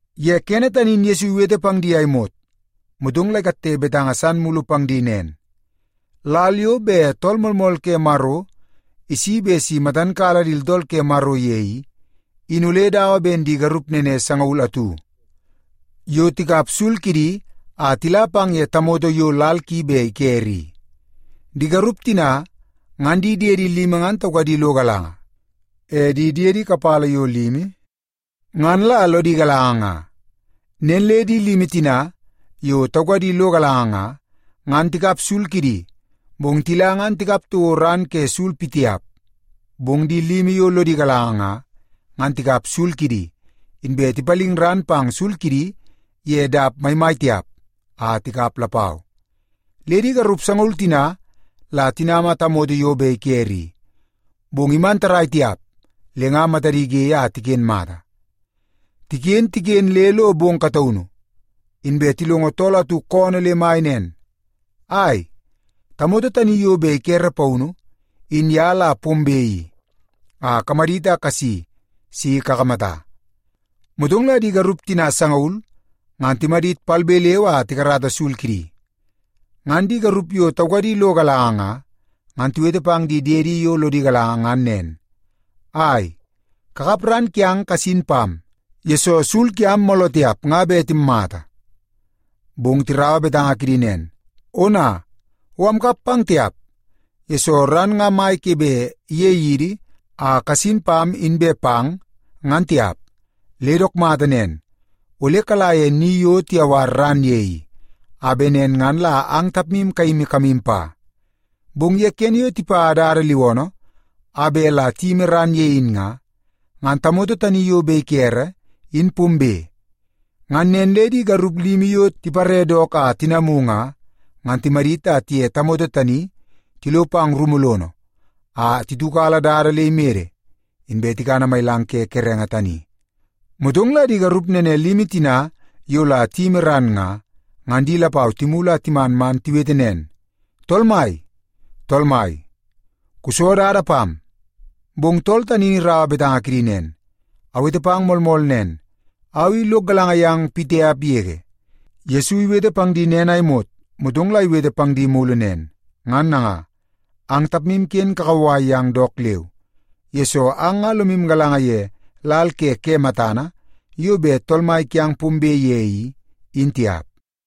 Ye kene tani in Yesu iwete pang di a imot, motong la ikatte betanga san mulu pang di nen, “Lal yo bet Tool Moolmool ke Maro isi bet si matan kala di tooltool ke Maro ye i, in ole dawa ben di garup nene sangaul atu yo tikap sul kidi a tila pang ye tamoto yo lal ki bet ikere i. Di garup tina ngan di diedi limi ngan taukadi lo galanga, e di diedi kapala yo limi ngan la lodi galanga nga. Nen le di limi tina yo taukadi lo galanga nga, ngan tikap sul kidi, bong tila ngan tikap toko ran ke sul pitiap. Bong di limi yo lodi galanga nga, ngan tikap sul kidi, inbe tipaling ran pang sul kidi ye dap maimai tiap a tikap lapau. Le di garup sangaul tina la tinama tamoto yo bet ikere i, bong iman tarrai tiap le nga matadi ge a tiken mata. “Tiken, tiken le lo bong kataunu, inbe tilongo tool atu koonoo le mai nen, ‘Ai, tamoto tani yo bet ikere paunu in ye la pombe i, a kamadit a kasi si kakamata.’ “Motong la di garup tina sangaul ngan timadit palbe leu a tikarata sul kidi. Ngan di garup yo taukadi lo galanga nga, ngan tiwete pang di diedi yo lodi galanga ngan nen, ‘Ai, kakap ran kiang kasin pam, yesoo sul kiam mooloo tiap nga bet timmata.’ “Bong tiraua betanga kidi nen, ‘Ona, o amkap pang tiap, yesoo ran nga mai ke bet ige yidi a kasin pam inbe pang, ngan tiap. Le dook mata nen, ole kala ye ni yo tiyawar ran ye i, a bet nen ngan la ang tapmu kayimi kamu pa.’ “Bong ye kene yo tipa dada liwoonoo a bet la tiyimi ran ye in nga, ngan tamoto tani yo bet ikere, in pombe. Ngan nen le di garup limi yo tipare dook a tinamu nga, ngan timadit a tiye tamoto tani tilo pang rumu lono a titiukala dada le imede, inbe tikana mailang ke kerenge tani. “Motong la di garup nene limi tina yo la tiyimi ran nga, ngan di lapau timulu a timan man tiwete nen, ‘Tool mai, tool mai, kuso dada pam!’ “Bong tool tani in iraua betanga kidi nen, ‘Awete pang moolmool nen, au i lok galanga yang pitiap yege.’” Yesu iwete pang di nen a imot, motong la iwete pang di mulu nen, “Ngan nanga, ang tapmu ken kakauwai yang dook leu, yesoo ang nga lomu galanga ye lal le ke matana yo bet Tool Mai kiang pombe ye i, in tiap.”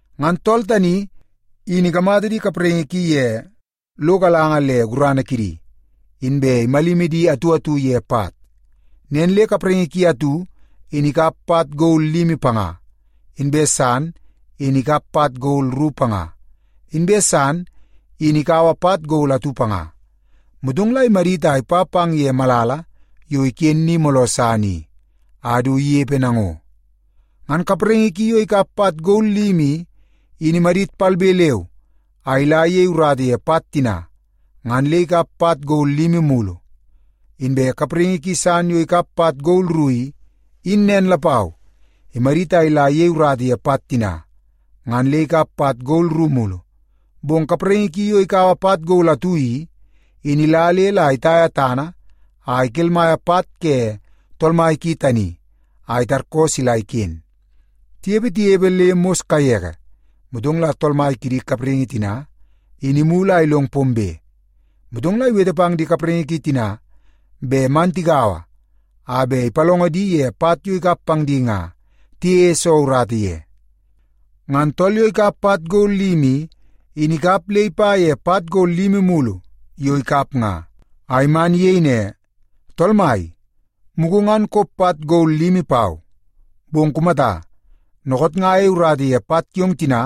Ngan tool tani in ikamata di kapraingi ki ye lo galanga le gurana kidi, inbe imalimi di atu atu ye pat. Nen le kapraingi ki atu in ikap pat gol limi panga, inbe san in ikap pat gol ru panga, inbe san in ikaua pat gol atu panga. Motong la imadit a ipa pang ye malala yo iken ni mooloo san i, a du inepe nango. Ngan kapraingi ki yo ikap pat gol limi i, in imadit palbe leu a ila iyei urata ye pat tina, ngan le ikap pat gol limi mulu. Inbe kapraingi ki san yo ikap pat gol ru i, in nen lapau, imadit a ila iyei urata ye pat tina, ngan le ikap pat gol ru mulu. Bong kapraingi ki yo ikaua pat gol atu i, in ila le la itaia tana a ikelmaia pat ke tool mai ki tani a itarkoo sila iken. “Tinepe, tinepe le mos kaiye, motong la tool mai kidi kapraingi tina, in imulu a ilong pombe. Motong la iwete pang di kapraingi ki tina bet man tigaua a bet ipalongo di ye pat yo ikap pang di nga tiyeie soo urata ye. Ngan tool yo ikap pat gol limi i, in ikap le ipa ye pat gol limi mulu yo ikap nga, a iman iyei ne, ‘Tool mai, mugu ngan kop pat gol limi pau, bong kumata, dookoot nga ayei urata ye pat kiong tina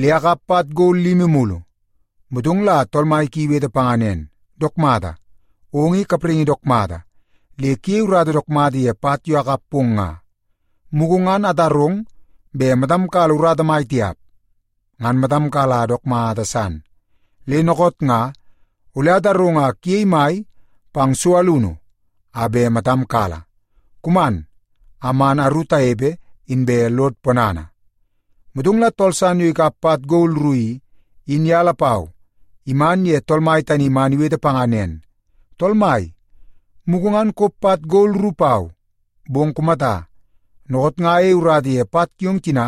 le akap pat gol limi mulu.’ “Motong la tool mai ki iwete panga nen, ‘Dook mata! Ong i kapraingi dook mata le kuyei urata dook mata ye pat yo akap pong nga! Mugu ngan atarong bet matam kala urata mai tiap, ngan matam kala dook mata san. Le dookoot nga ole atarong a kuyei mai pang so alunu a bet matam kala. Kuman a man aru tanepe, inbe lod ponana.’ “Motong la tool san yo ikap pat gol ru i, in ye lapau iman ye tool mai tani man iwete panga nen, ‘Tool mai, mugu ngan kop pat gol ru pau, bong kumata, dookoot nga ayei urata ye pat kiong tina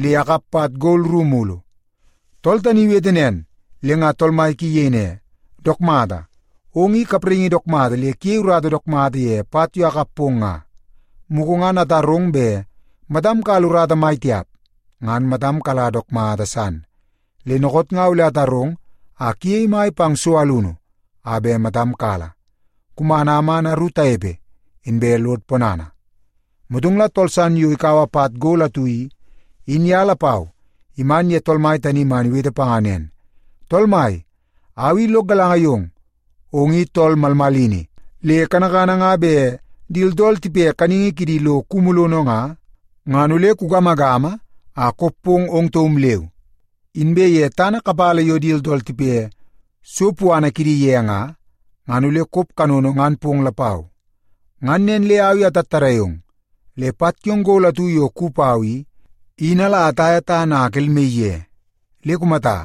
le akap pat gol ru mulu.’ “Tool tani iwete nen, le nga tool mai ki iyei ne, ‘Dook mata! Ong i kapraingi dook mata le kuyei urata dook mata ye pat yo akap pong nga! Mugu ngan atarong bet matam kala urata mai tiap, ngan matam kala dook mata san. Le dookoot nga ole atarong a kuyei mai pang so alunu a bet matam kala. Kuman a man aru tanepe, inbe lod ponana.’ “Motong la tool san yo ikaua pat gol atu i, in ye lapau iman ye tool mai tani man iwete panga nen, ‘Tool mai, au i lok galanga yong. Ong i tool malmalini, le kanakana nga bet di tooltool tipe kaningi kidi lo kumu lono nga, ngan ole kugamagama a kop pong ong taum leu. Inbe ye tana kapala yo di tooltool tipe so puana kidi ye nga, ngan ole kop kanono ngan pong lapau. Ngan nen le au i atattadai ong, le pat kiong gol atu yo kuwi pau i, in ala ataia tana a akelmaii ye. Le kumata,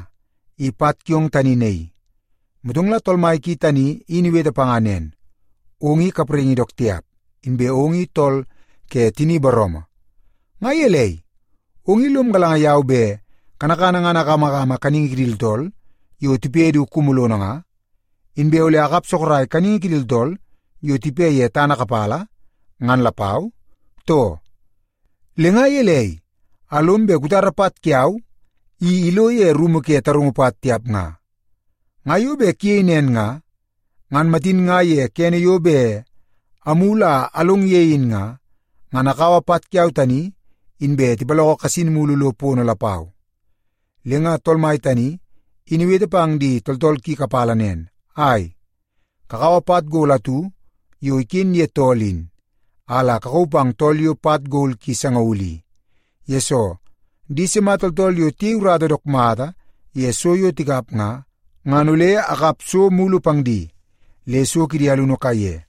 i pat kiong tani naii.’ “Motong la tool mai ki tani in iwete panga nen, ‘Ong i kapraingi dook tiap, inbe ong i tool ke tini booroomoo. Nga gelei, ong i lom galanga yau bet kanakana ngan agamagama kaningi kidi tooltool yo tipe du kumu lono nga, inbe ole akap sorok kaningi kidi tooltool yo tipe ye tana kapala ngan lapau, too? Le nga gelei a lom bet kutara pat kiau i ilo ye rumu ke tarungu pat tiap nga? Nga yo bet kuyei nen nga, ngan matin nga ye kene yo bet amulu a along ye in nga, ngan akaua pat kiau tani, inbe tipaloko kasin mulu lo pono lapau.’ “Le nga tool mai tani in iwete pang di tooltool ki kapala nen, ‘Ai, kakaua pat gol atu yo iken ye tool in, a la kakauu pang tool yo pat gol ki sangaul i. Yesoo, di sima tooltool yo tiyei urata dook mata ye so yo tikap nga, ngan ole akap so mulu pang di, le so kidi alunu kaiye.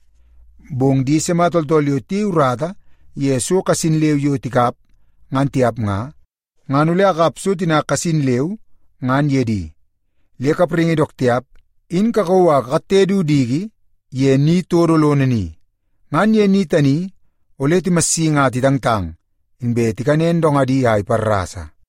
Bong di sima tooltool yo tiyei urata ye so kasin leu yo tikap ngan tiap nga, ngan ole akap so tina kasin leu, ngan ye di. Le kapraingi dook tiap, in kakauu a kakatte du diki ye ni todo lono ni. Ngan ye ni tani, ole timassingi a titangtang, inbe tikanen dongadi a iparrasa.’”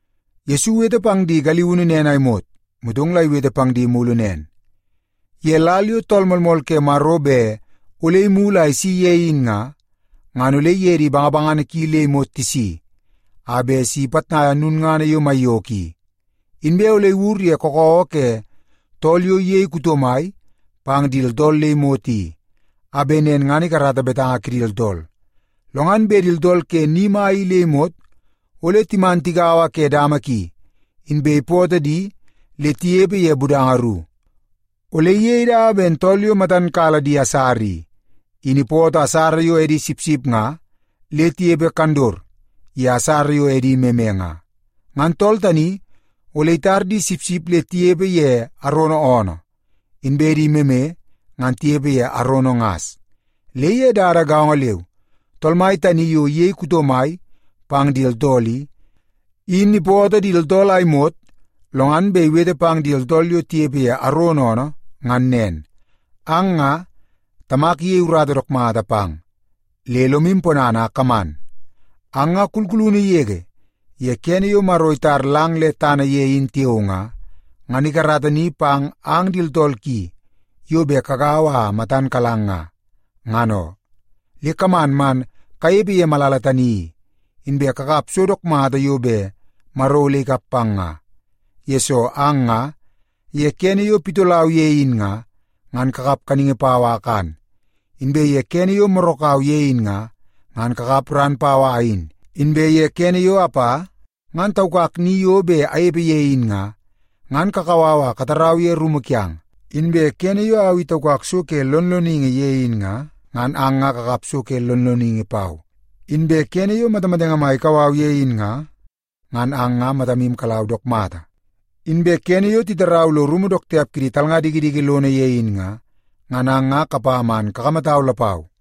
Yesu iwete pang di galiunu nen a imot, motong la iwete pang di mulu nen, “Ye lal yo Tool Moolmool ke Maro bet ole imulu a isi ye in nga, ngan ole iye di bangabangana ki le imot tisi, a bet si ipitnaia lulngana yo maiyoko i. Inbe ole iwur ye kakawa ke tool yo iyei kuto mai pang di tooltool le imot i, a bet nen ngan ikarata betanga kidi tooltool. Lo ngan bet di tooltool ke ni mai i le imot, ole timan tigaua ke dama ki, inbe ipoto di le tinepe ye budanga ru. Ole iyei dawa ben tool yo matan kala di asara i, in ipoto di asara yo edi sipsip nga le tinepe kandot ye di asara yo edi meme nga. Ngan tool tani ole itar di sipsip le tinepe ye arono oonoo, inbe di meme ngan tinepe ye arono ngas. “Le ye dada gaongo leu, tool mai tani yo iyei kuto mai pang di tooltool i, in ipoto di tooltool a imot, lo ngan bet iwete pang di tooltool yo tinepe ye arono oonoo ngan nen, ‘Ang nga, Tamak iyei urata dook mata pang, le lomu ponana a kaman. Ang nga, kulkulunu yege ye kene yo Maro itar lang le tana ye in tiao nga, ngan ikarata ni pang ang di tooltool ki yo bet kagaua a matan kalang nga, ngan oo. Le kaman man kanepe ye malala tani i, inbe kakap so dook mata yo bet Maro ole ikap pang nga. Yesoo ang nga ye kene yo pitolau ye in nga, ngan kakap kaningi pau a akan. Inbe ye kene yo morakau ye in nga, ngan kakap ran pau a ayin. Inbe ye kene yo apa ngan taukak ni yo bet anepe ye in nga, ngan kakau au a katarau ye rumu kiang. Inbe kene yo au i taukak so ke lonloningi ye in nga, ngan ang nga kakap so ke lonloningi pau. Inbe kene yo matamatenge mai ikau au ye in nga, ngan ang nga matamu kalau dook mata. Inbe kene yo titarau lo rumu dook tiap kidi talnga dikidiki lono ye in nga, ngan ang nga kapa man kakamatau lapau.’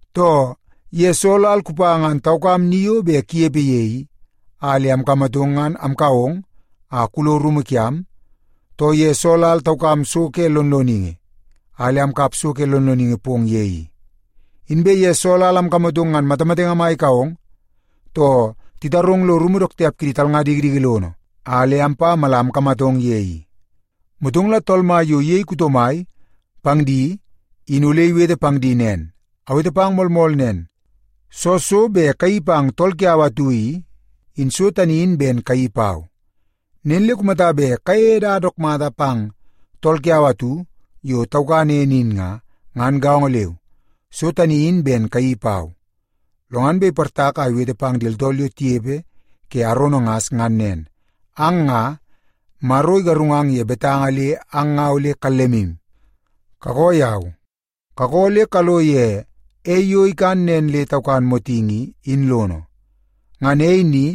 Too, ye soo lal kupa ngan taukam ni yo bet kunepe ye i, a le amkamatong ngan amkau ong a kulo rumu kiam, too ye soo lal taukam so ke lonloningi, a le amkap so ke lonloningi pong ye i? Inbe ye soo lal amkamatong ngan matamatenge mai ikau ong, too titarong lo rumu dook tiap kidi talnga dikidiki lono a le ampa mala amkamatong ye i?’ “Motong la Tool Mai yo iyei kuto mai pang di in ole iwete pang di nen, ‘Awete pang moolmool nen, soo so bet kayeii pang tool kiau atu i, in so tani in ben kayeii pau. Nen le kumata bet kayeie dada dook mata pang tool kiau atu yo taukan ene in nga, ngan gaongo leu, so tani in ben kayeii pau.’ “Lo ngan bet iportak a iwete pang di tooltool yo tinepe ke arono ngas ngan nen. ‘Ang nga, Maro igarungang ye betanga le ang nga ole kallemu. Kakoo yau! Kakoo le kalo ye ei yo ikan nen le taukan motingi i, in lono. Ngan ei ni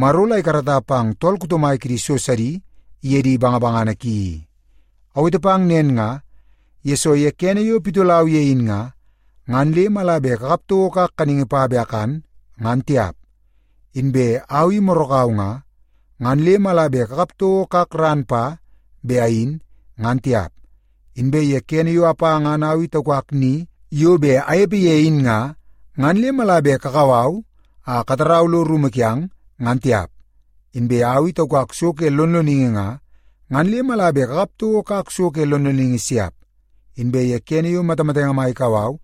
Maro la ikarata pang tool kuto mai kidi so sidi iye di bangabangana ki i. Awete pang nen nga, yesoo ye kene yo pitolau ye in nga, ngan le mala bet kakap toko kak kaningi pa bet akan, ngan tiap. Inbe au i morakau nga, ngan le mala bet kakap toko kak ran pa bet ayin, ngan tiap. Inbe ye kene yo apa ngan au i taukak ni yo bet anepe ye in nga, ngan le mala bet kakau au a katarau lo rumu kiang, ngan tiap. Inbe au i taukak so ke lonloningi nga, ngan le mala bet kakap toko kak so ke lonloningi siap. Inbe ye kene yo matamatenge mai ikau au,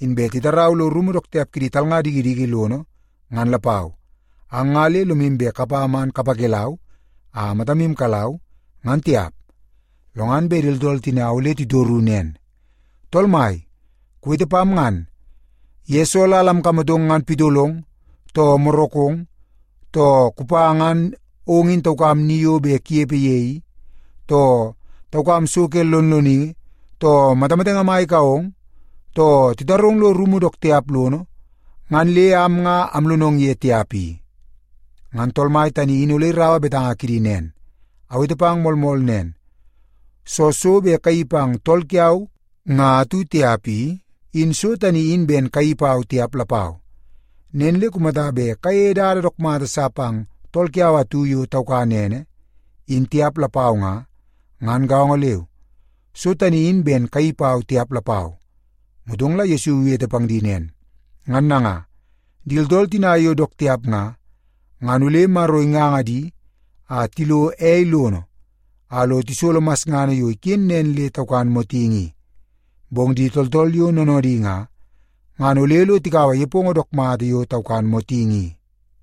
inbe titarau lo rumu dook tiap kidi talnga dikidiki lono ngan lapau, ang nga le lomu bet kapa man kapakelau a matamu kalau, ngan tiap.’ “Lo ngan bet di tooltool tina ole titoru nen, ‘Tool Mai, kuwete pam ngan. Ye soo lal amkamatong ngan pitolong, too morakong, too kupa ngan ong in taukam ni yo bet kunepe ye i, too taukam so ke lonloningi, too matamatenge mai kau ong, too titarong kulo rumu dook tiap lono, ngan le am nga amlonong ye tiap i?’ “Ngan Tool Mai tani in ole iraua betanga kidi nen, ‘Awete pang moolmool nen. Soo so bet kayeii pang tool kiau nga atu tiap i, in so tani in ben kayeii pau tiap lapau. Nen le kumata bet kayeie dada dook mata sa pang tool kiau atu yo taukan ene, in tiap lapau nga, ngan gaongo leu, so tani in ben kayeii pau tiap lapau.’” Motong la Yesu iwete pang di nen, “Ngan nanga, di tooltool tina yo dook tiap nga, ngan ole Maro inganga di a tilo ei lono a lo tisolo masngana yo iken nen le taukan motingi i. Bong di tooltool yo noonoodi nga, ngan ole lo tikaua nepongo dook mata yo taukan motingi i.”